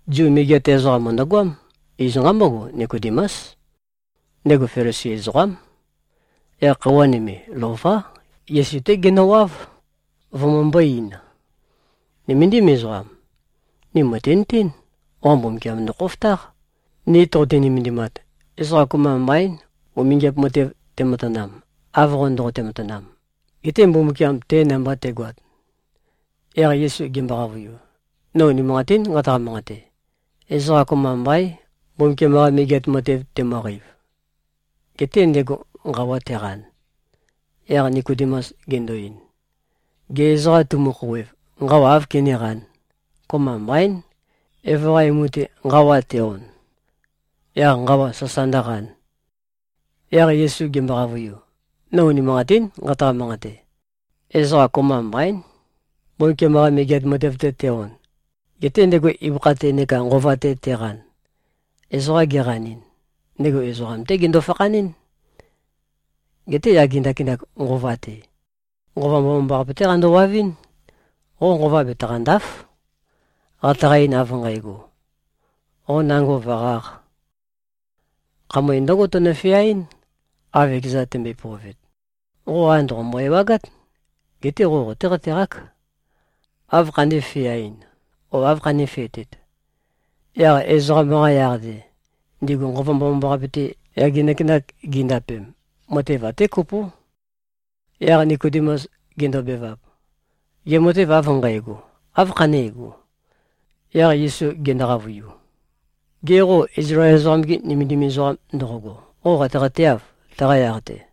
Zu megeat ezoqam mø̀ndøgoám. Iz nqambógo. Nikodemús. Ndego Felisi ezoqám. Yaq khøuwa nøme, lová, Yesu-té genøwáv, vømømbō-ein, “Nøméndim ezoqam. Ni mø̀tinøtén. Qo Mbumbukiam ndokhofotáq, ni toqote-nømendimat. Ezoqa kopømba mbaín, umingiap matev tematanam, av qo ndoqote-matanam, getē Mbumbukiam te namba te꞉goat.” Yaq Yesu gembo-qavøiu, “No unimanqatín nqataqa-manqate: Ezoqa kopømba mbaín, Mbumbukiam-qa Megeat Matev temøqeiv, getē ndego nqawa teqan.” Yaq Nikodemus gendo-ein, “Gê, ezoqa temu-khouwev, nqawa áv kenéqān? Kopømba mbaín, evo-qa emu-te nqawa te-on, yaq nqawa sasa ndǿqān.” Yaq Yesu gembo-qavøiu, “No unimanqatín nqataqa-manqate: Ezoqa kopømba mbaín, Mbumbukiam-qa Megeat Matev-te te-on, getē ndego ibøkha-te neka nqova-te teqan. Ezoqa geqanɨn, ndego ezoqam-té gendo-fakhanɨ́n. Geté yage ndakinak nqova-te, Nqova Mbomambaqape-té qandowavɨ́n. Qo nqova betaqànda᷄f, qataqa-ein av nqægo, qo nango vø̀qāq. Khamøe ndǿgo tønø-feaɨ́n, av ekezan tømbøe-pøovet. Qo, a, ndòqombo-ewagát. Geté qo qotéqateqák, āv khandē-feaɨn o āv khanēfetet. Yaq ezoqam-qa yaq-te, ndigu Nqova Mbomambaqape-te, yage ndakinak gindapem, matev até kopó.” Yaq Nikodemus gendobevap, “Gê, matev av nqægo, áv khanégo?” Yaq Yesu gendo-qavøiu, “Gê, qo Izlael ezoqam-ge nømendim ezoqam ndoqogo, qo qateqateâv, taqa yaq-te?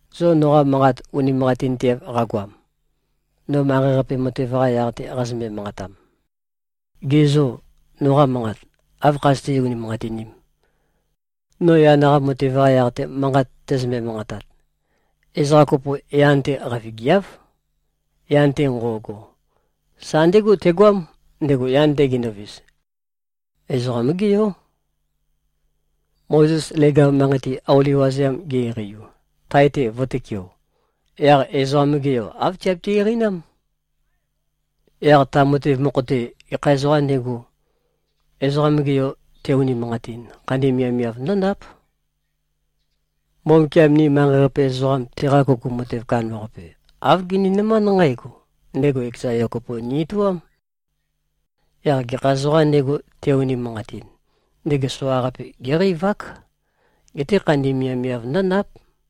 Zo noqa manqat unimanqatinteav qagoam, no manqei-qape matev-qa yaq-te qazømbe-manqatam, gê, zo noqa manqat áv khazøté-unimanqatinīm, no yan-qa matev-qa yaq-te, manqat tæzømbe-manqatat? Ezoqa kopo yan-te qavigiáv. Yan-te nqo꞉go, sa ndégo tegoám, ndego yan-te gendovis. Ezoqam-gé Yó. Mozes leg-av manqei-te, auli wazeam ge-eqeiu, tae-te vø̄tøkeo, yaq Ezoqam-ge Yo āv tiabiti-eqeinám. Yaq ta matev mokho-te, gekha ezoqām ndego, Ezoqam-ge Yo te-unimanqatin, khandi miavmiav ndǿndáp. Mbumbukiam ni manqei-qape ezoqam, teqa kuku matev kandambaqape, āv gininømánd nqǽgo: Ndego ekeza Yo kopo ni-etoám. Yaq gekha ezoqām ndego, te-unimanqatin, ndego soqaqape géqeivák, geté khandi miavmiav ndǿndáp.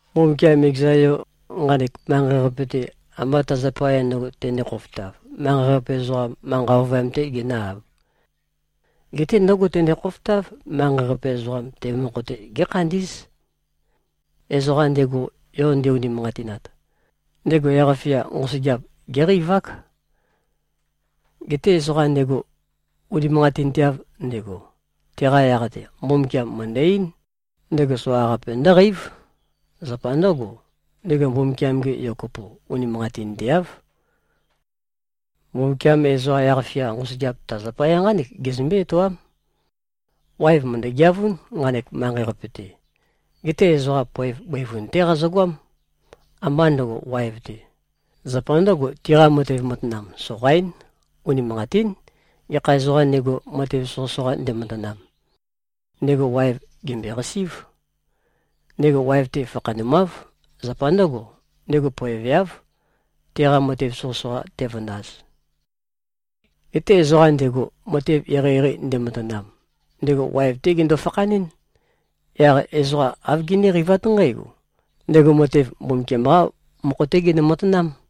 Mbumbukiam ekeza Yo, nqanek manqei-qape-te, ambá ta zapaya ndø̄go tendē-khofotav, manqei-qape ezoqam, manqa ovøyam-tē genǿ-āb. Geté ndǿgo tende-khofotáv, manqei-qape ezoqam, te mokho-te gékhandí꞉z. Ezoqam ndego, Yo nde-unimanqatinat, ndego yaq-fia nqosøgeap géqeivák. Geté ezoqam ndego, unimanqatinteav ndego, teqa yaq-te Mbumbukiam mø̀ndø-eín, ndego soqaqape ndǿqeív. Zapa ndǿgo, ndego Mbumbukiam-ge Yo kopo unimanqatinteáv. Mbumbukiam ezoqa yaq-fia nqosøgeap ta zapaya nqánek gezømbé-etoám: Waev mø̀ndø-geavún, nqanek manqei-qape-te. Geté ezoqa poev bøivun-té qazøgoám, ambá ndøgo, waev-te. Zapa ndǿgo, tiqa matev matanam soqaín. Unimanqatín. Gekha ezoqām ndego, matev soqøsoqa ndematanam, ndego waev gèmbøeqasí꞉v. Ndego waev-te fakhanumáv. Zapa ndǿgo, ndego poeveáv, teqa matev soqøsoqa tevøndaz. Geté ezoqam ndego, matev eqeieqei ndematanam, ndego waev-té gendo-fakhanɨ́n. Yaq ezoqa āv giníqeivát nqǽgo: Ndego matev, Mbumbukiam-qá mokho-té genø-matanám.”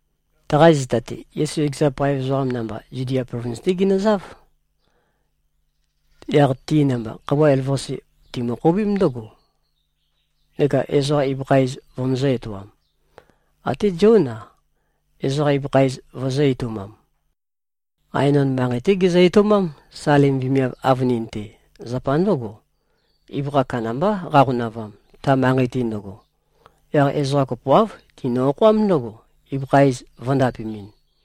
Taqa zita-te, Yesu ekeza paev ezoqa namba Zudia plovins-té ginøzáv. Yaq ti namba khøuwa elavøqasi timø-khoubím ndǿgo, neka ezoqa ibøkha iz vømøzø̄-etoam. Até Zión-a, ezoqa ibøkha iz vøzø̄-etoumam. Aenon manqei-té gezø-etoumám, Salim vemiav avønin-te. Zapa ndǿgo, ibøkha kandambá qaqonavam, ta manqei-te ndøgo. Yaq ezoqa kopoáv tinø-okhoám ndǿgo, ibøkha iz vø̄ndapemɨn.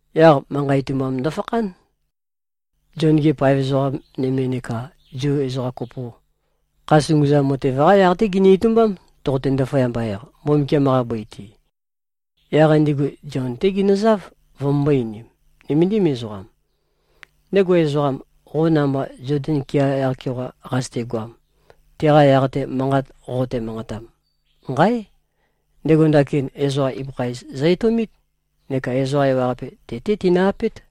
Yaq manqa itumbam ndøfakhán, Zion-gi paev ezoqa nøme neka Zu ezoqa kopo. Kha sunguzam matev-qá yaq-té gini-itumbám, toqote-ndaføyamba-eq Mbumbukiam-qa bøi-te. Yaq ndigu Zion-té ginøzáv, vømømbō-einim, “Nøméndim ezoqam. Ndego ezoqam, qo namba Zoden kea yaq-keoqa qazøtegoam, teqa yaq-te manqat qoqote-manqatam, nqáe! Ndego ndakin ezoqa ibøkha iz zø-etoumít neka ezoqa ewaqape te-té tinø-apét.”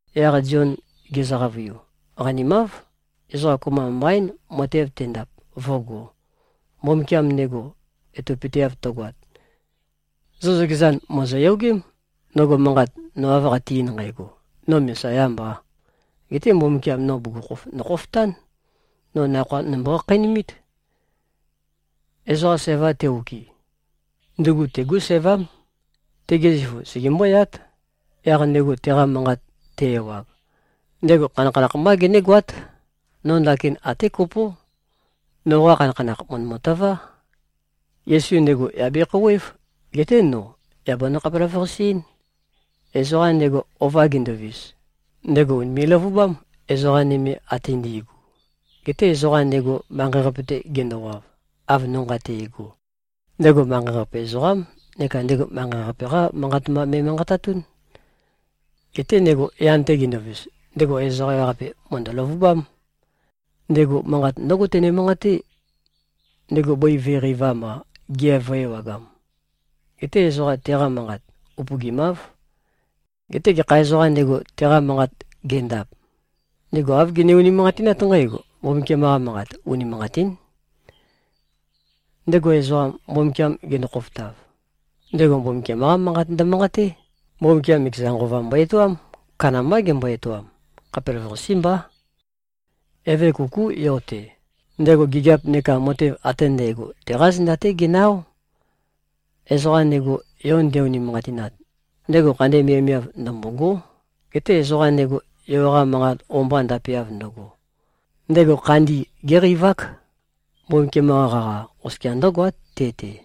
Yaq Zion gezø-qavøiu, “Qanimáv. Ezoqa kopømba mbaín, matev tendap, vǿgō, Mbumbukiam ndego etopøteav tøgoat. Zo zøkezan mòzoyogém, ndøgo manqat, no av qate-ein nqægo, ‘No Mesayā mbā. Getē Mbumbukiam no bugukhokhof ndokhofotān. No nakhoa nombo-khakheinumīt’. Ezoqa sævam te-okɨ, ndugu tegú sævám. Tege zifu segembóyát. Yaq ndego teqa manqat te-ewag, ndego khanakhanakh mbá genégoát. No ndakin até kopó, noqa khanakhanakh mø̀ndømø-tøvá. Yesu ndego yà bekhouwév. Geté no yà banø-khapelavøqase-én. Ezoqam ndego ova gendovis, ndego ùnime꞉-løvubám, ezoqa nøme ate ndi꞉gu. Geté ezoqam ndego, manqei-qape-te gendowav, av no nqate꞉go, ndego manqei-qape ezoqám neka ndego manqei-qape-qá manqat mba me꞉manqatatún. Geté ndego yan-te gendovis, ndego ezoqa ewaqape mø̀ndø-løvubám. Ndego manqat ndǿgo tene-manqaté, ndego bøi vø̄e-qeivam-a, gea vø̄e-ewagam. Geté ezoqa teqa manqat upøgimáv. Geté gekha ezoqām ndego, teqa manqat gendap, ndego āv gene-unimanqatinát nqǽgo: Mbumbukiam-qa manqat unimanqatín. Ndego ezoqam, Mbumbukiam gendo-khofotav, ndego Mbumbukiam-qá manqat ndømanqaté. Mbumbukiam ekeza Nqova mbo-etoám. Kandambá gembo-etoam. Khapelavøqasé mbá. Eve kukú Yo-te. Ndego gigiap neka matev ate ndægo, teqá zenda-té genø-áo. Ezoqam ndego, Yo nde-unimanqatinat, ndego khandi miavmiav ndømbôgó. Geté ezoqam ndego, Yo-qa manqat o-mba ndapeav ndøgo, ndego khandi géqeivák. Mbumbukiam-qa qaqa, oskia ndǿgoát te-te.”